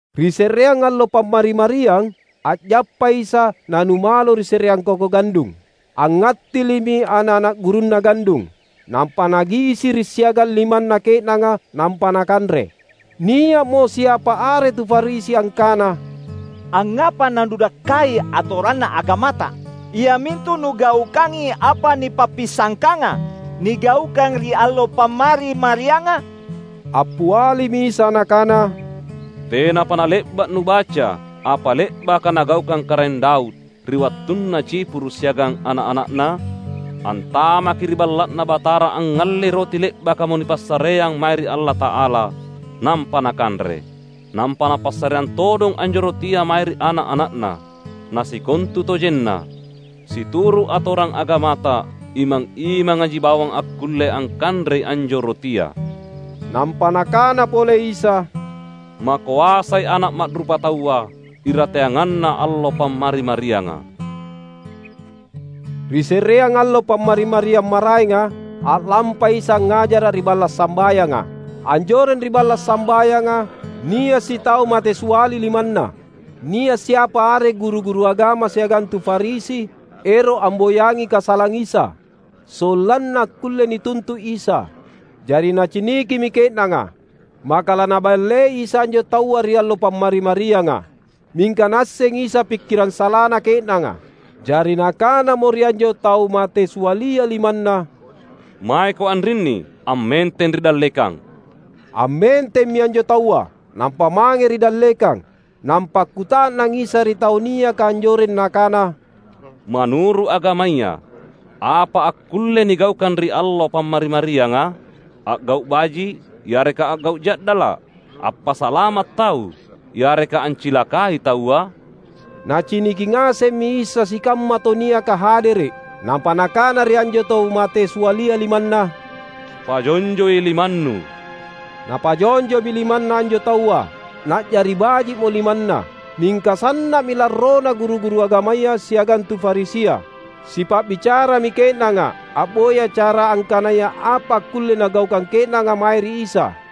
Ri se’reang allo Pammari-mariang, a’jappai Isa na numalo ri se’reang koko gandung. Angngattili’mi ana’-ana’ gurunNa gandung, nampa nagisiri’ siagang limanna ke’nanga nampa nakanre. Nia’mo siapa are tu Farisi angkana, "Angngapa naNudakkai atoranna agamata, iamintu Nugaukangi apa nipappisangkanga nigaukang ri allo Pammari-marianga?" Appialimi Isa Nakana, "Tenapa nale’ba’ nubaca apa le’baka nagaukang Karaeng Daud, ri wattunna cipuru’ siagang ana’-ana’na? Antamaki ri Balla’Na Batara angngallei roti le’bakamo nipassareang mae ri Allata’ala, nampa nakanre. Nampa napassareang todong anjo rotia mae ri ana’-ana’na. Na sikontutojenna, situru’ atorang agamata, imang-imangaji bawang akkulle angkanrei anjo rotia." Nampa Nakana pole Isa, "Makoasai Ana’ Ma’rupataua irateanganna allo Pammari-marianga!" Ri se’reang allo Pammari-mariang maraenga, a’lampai Isa angngajara’ ri balla’ sambayanga. Anjoreng ri balla’ sambayanga, nia’ sitau mate siali limanna. Nia’ siapa are guru-guru agama siagang tu Farisi ero’ amboyangi kasalang Isa, sollanna akkulle nituntu’ Isa. Jari nacinikimi ke’nanga, maka laNaballei Isa anjo taua ri allo Pammari-marianga. Mingka Naassengi Isa pikkirang salana ke’nanga. Jari Nakanamo ri anjo tau mate sialia limanna, "Maeko anrinni ammenteng ri dallekang!" Ammentemmi anjo taua, nampa mange ri dallekang. Nampa akkuta’nang Isa ri tau niaka anjoreng Nakana, "Manuru’ agamaya apa akkulle nigaukang ri allo Pammari-marianga? A’gau’ baji’ yareka a’gau’ ja’dala’? Appasalama’ tau yareka ancilakai taua?" Naciniki ngasemmi Isa sikamma tau niaka hadere’. Nampa Nakana ri anjo tau mate sialia limanna, "Pajonjoi limannu." Napajonjomi limanna anjo taua, na’jari baji’mo limanna. Mingka sanna’mi larrona guru-guru agamaya siagang tu Farisia. Sipa’bicarami ke’nanga a’boya cara angkanaya apa akkulle nagaukang ke’nanga mae ri Isa.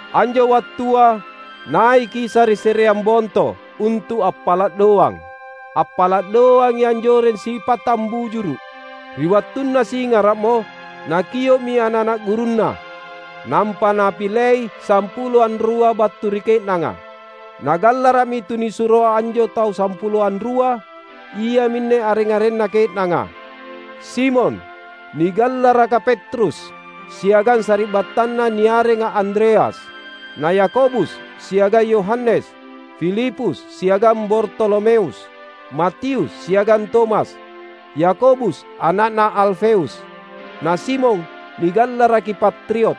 Anjo wattua naiki Isa ri se’reang bonto, untu’ appala’ doang. Appala’ doangi anjoreng sipattang bujuru’. Ri wattunna singara’mo, Nakio’mi ana’-ana’ gurunNa. Nampa Napilei sampulo anrua battu ri ke’nanga. Nagallara’mi tunisuro anjo tau sampuloa anrua. Iaminne areng-arenna ke’nanga: Simon (nigallaraka Petrus,) siagang sari’battanna niarenga Andreas; na Yakobus siagang Yohanes, Filipus siagang Bartolomeus, Matius siagang Tomas, Yakobus ana’na Alfeus, na Simon (nigallaraki Patriot),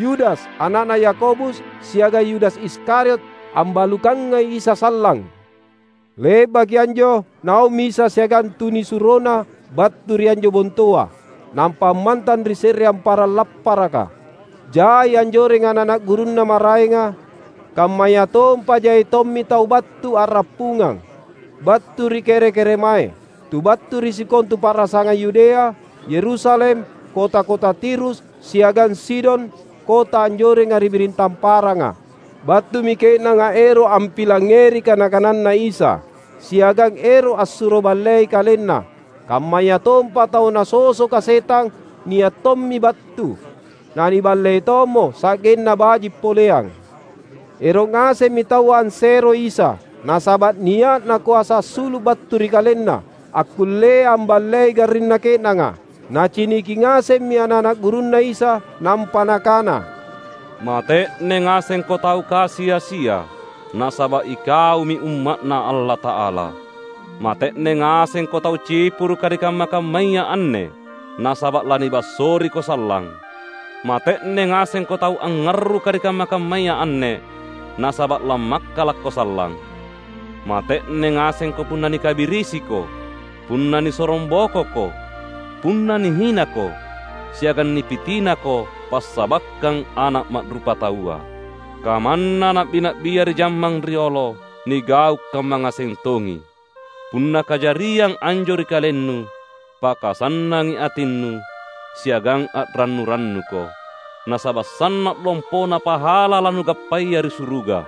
Yudas ana’na Yakobus siagang Yudas Iskariot ambalukangai Isa sallang. Le’baki anjo naummi Isa siagang tunisuroNa battu ri anjo bontoa, nampa ammantang ri se’reang parang lapparaka. Jai anjoreng ana’-ana’ gurunNa maraenga, kammayatompa jai tommi tau battu a’rappungang, battu ri kere-keremae: tu battu ri sikontu pa’rasangang Yudea, Yerusalem, kota-kota Tirus, siagang Sidon kota anjorenga ri biring tamparanga. Battumi ke’nanga ero’ ampilangngeri kana-kananNa Isa, siagang ero’ assuro ballei kalenna. Kammayatompa tau nasosoka setang nia’ tommi battu, naniballei tommo, sa’genna baji’ poleang. Ero’ ngasemmi taua anseroi Isa, nasaba’ nia’na koasa assulu’ battu ri KalenNa, akkullea amballei garrinna ke’nanga. Naciniki ngasemmi ana’-ana’ gurunNa Isa, nampa Nakana, "Mate’ne ngasengko tau kasi-asia, nasaba’ ikaumi umma’Na Allata’ala! Mate’ne ngasengko tau cipuruka ri kamma-kammaya anne; nasaba’ lanibassoriko sallang! Mate’ne ngasengko tau angngarruka ri kamma-kammaya anne; nasaba’ lammakkalakko sallang! Mate’ne ngasengko punna nikabirisiko, punna nisorongbokoko, punna nihinako, siagang nipitinako passabakkang Ana’ Ma’rupataua! Kamanna na’bi-na’bia ri jammang riolo nigau’ kamma ngaseng tongi. Punna kajariang anjo ri kalennu, pakasannangi atinnu siagang a’rannu-rannuko; nasaba’ sanna’ lompona pahala lanugappaya ri suruga.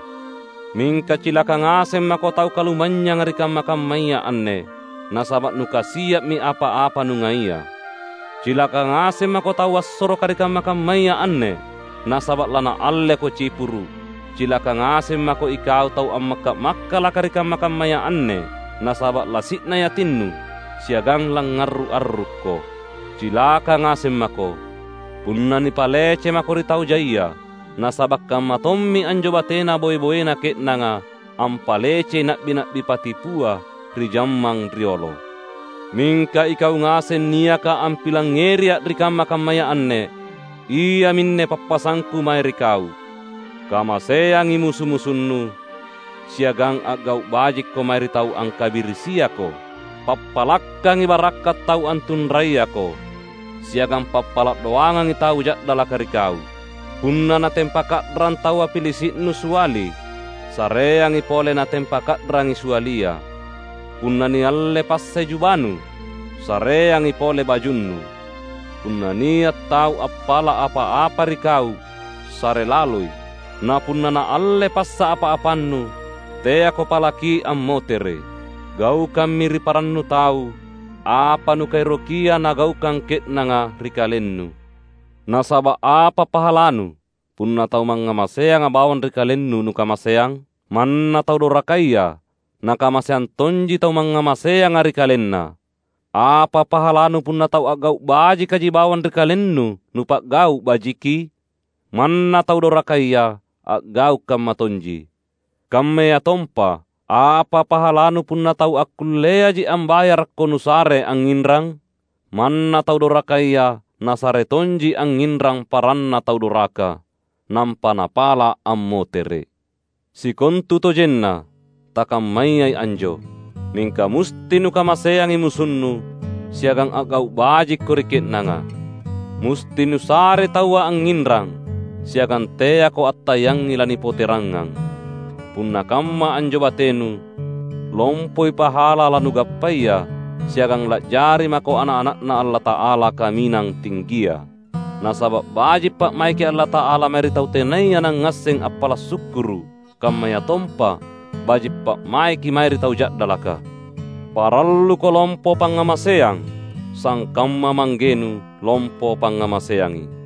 Mingka cilaka ngaseng mako tau kalumanynyanga ri kamma-kammaya anne; nasaba’ nukasia’mi apa-apa nungaia! Cilaka ngaseng mako tau bassoroka ri kamma-kammaya anne; nasaba’ lanaalleko cipuru’! Cilaka ngaseng mako ikau tau ammakka’-makkalaka ri kamma-kammaya anne; nasaba’ lasi’nai atinnu siagang langngarru’-arrukko! Cilaka ngaseng mako, punna nipalece mako ri tau jaia; nasaba’ kammatommi anjo batena boe-boena ke’nanga ampalecei na’bi-na’bi patipua ri jammang riolo." "Mingka ikau ngaseng niaka ampilangngeriA’ ri kamma-kammaya anne, iaminne pappasangKu mae ri kau: kamaseangi musu-musunnu, siagang a’gau’ bajikko mae ri tau angkabirisiako. Pappalakkangi barakka’ tau antunrayako, siagang pappala’ doangangi tau ja’dalaka ri kau. Punna natempa ka’rang taua pilisi’nu siali, sareangi pole natempa ka’rangi sialia. Punna nialle passai jubanu, sareangi pole bajunnu. Punna nia’ tau appala’ apa-apa ri kau, sare laloi. Na punna naalle passa apa-apannu, teako palaki ammotere’. Gaukammi ri parannu tau apa nukaerokia nagaukang ke’nanga ri kalennu. Nasaba’ apa pahalanu punna tau mangngamaseanga bawang ri kalennu nukamaseang? Manna tau dorakaya nakamaseang tonji tau mangngamaseanga ri kalenna! Apa pahalanu punna tau a’gau’ bajikaji bawang ri kalennu nupa’gau’ bajiki? Manna tau dorakaya a’gau’ kamma tonji. Kammayatompa, apa pahalanu punna tau akkulleaji ambayarakko nusare angnginrang? Manna tau dorakaya nasare tonji angnginrang paranna tau doraka, nampa napala’ ammotere’! Sikontutojenna takammayai anjo! Mingka musti nukamaseangi musunnu, siagang a’gau’ bajikko ri ke’nanga. Musti nusarei taua angnginrang, siagang teako attayangi lanipoterangngang. Punna kamma anjo batenu, lompoi pahala lanugappaya, siagang la’jari mako ana’-ana’Na Allata’ala Kaminang Tinggia. Nasaba’ baji’ pa’maiki Allata’ala mae ri tau tenaya nangngasseng appala’ sukkuru’, kammayatompa baji’ pa’maiki mae ri tau ja’dalaka. Paralluko lompo pangngamaseang sangkamma Manggenu lompo pangngamaseangi."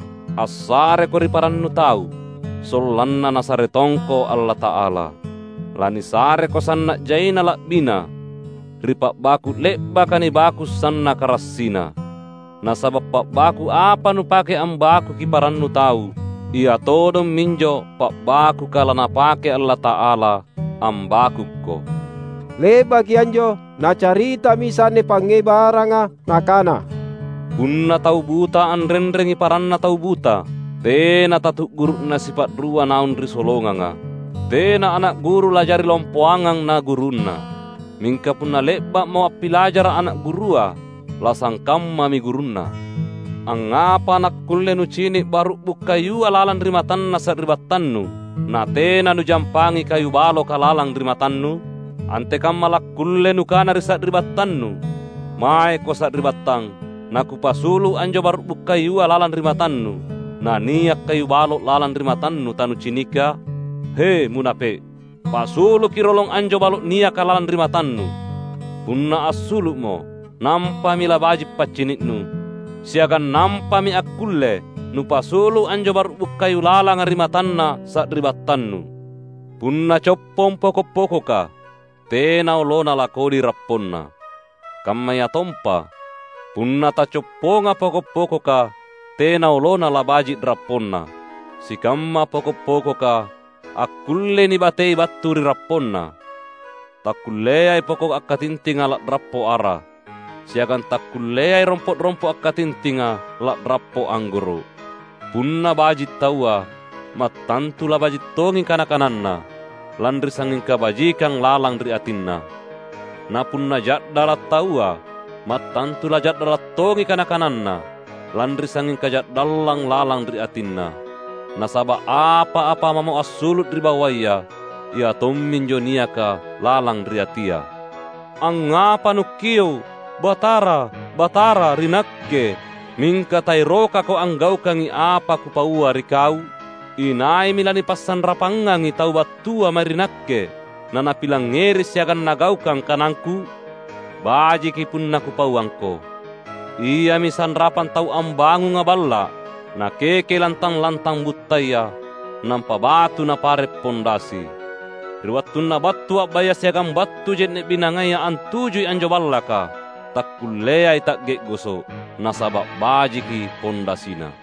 Assareko ri parannu tau, sollanna Nasare tongko Allata’ala; lanisareko sanna’ jaina la’bina, ri pa’baku’ le’baka nibaku’ sannaka rassina. Nasaba’ pa’baku’ apa nupake ambakuki parannu tau, ia todong minjo pa’bakuka laNapake Allata’ala ambakukko." Le’baki anjo Nacaritami Isa anne pangngebaranga, Nakana, "Punna tau buta anrenrengi paranna tau buta, tena tatu’guru’na sipa’rua naung ri solonganga. Tena ana’ guru la’jari lompoangang na gurunna. Mingka punna le’ba’mo appilajara’ ana’ gurua, lasangkammami gurunna. Angngapa nakkulle nucini’ baru’bu’ kayua lalang ri matanna sari’battannu, natena nujampangi kayu baloka lalang ri matannu? Antekamma lakkulle nukana ri sari’battannu, ‘Maeko sari’battang, nakupasulu’ anjo baru’bu’ kayua lalang ri matannu,’ na nia’ kayu balo’ lalang ri matannu tanucinika? He, munape’! Pasuluki rolong anjo balo’ niaka lalang ri matannu. Punna assulu’mo, nampami labaji’ paccini’nu, siagang nampami akkulle nupasulu’ anjo baru’bu’ kayu lalanga ri matanna sari’battannu." "Punna coppong poko’-pokoka, tena olona lakodi rapponna. Kammayatompa, punna tacopponga poko’-pokoka, tena olona labaji’ rapponna. Sikamma poko’-pokoka, akkullei nibatei battu ri rapponna. Takkulleai poko’ akkatintinga la’rappo ara. Siagang takkulleai rompo’-rompo’ akkatintinga la’rappo anggoro’. Punna baji’ taua, mattantu labaji’ tongi kana-kananna, lanri sangnging kabajikang lalang ri atinna. Na punna ja’dala’ taua, mattantu laja’dala’ tongi kana-kananna, lanri sangnging kaja’dallang lalang ri atinna. Nasaba’ apa-apa mamo assulu’ ri bawaya ia tomminjo niaka lalang ri atia." "Angngapa nukkio’, ‘Batara, Batara’ ri Nakke, mingka taerokako anggaukangi apa Kupaua ri kau? Inaimi lanipasanrapangangi tau battua mae ri Nakke, na napilangngeri siagang nagaukang kanangKu? — Bajiki punna Kupauangko –. Iami sanrapang tau ambangunga balla’, nakekei lantang-lantang buttaya, nampa batu napare’ pondasi. Ri wattunna battu a’baya siagang battu je’ne’ binangaya antujui anjo ballaka, takkulleai ta’ge’goso’, nasaba’ bajiki pondasina.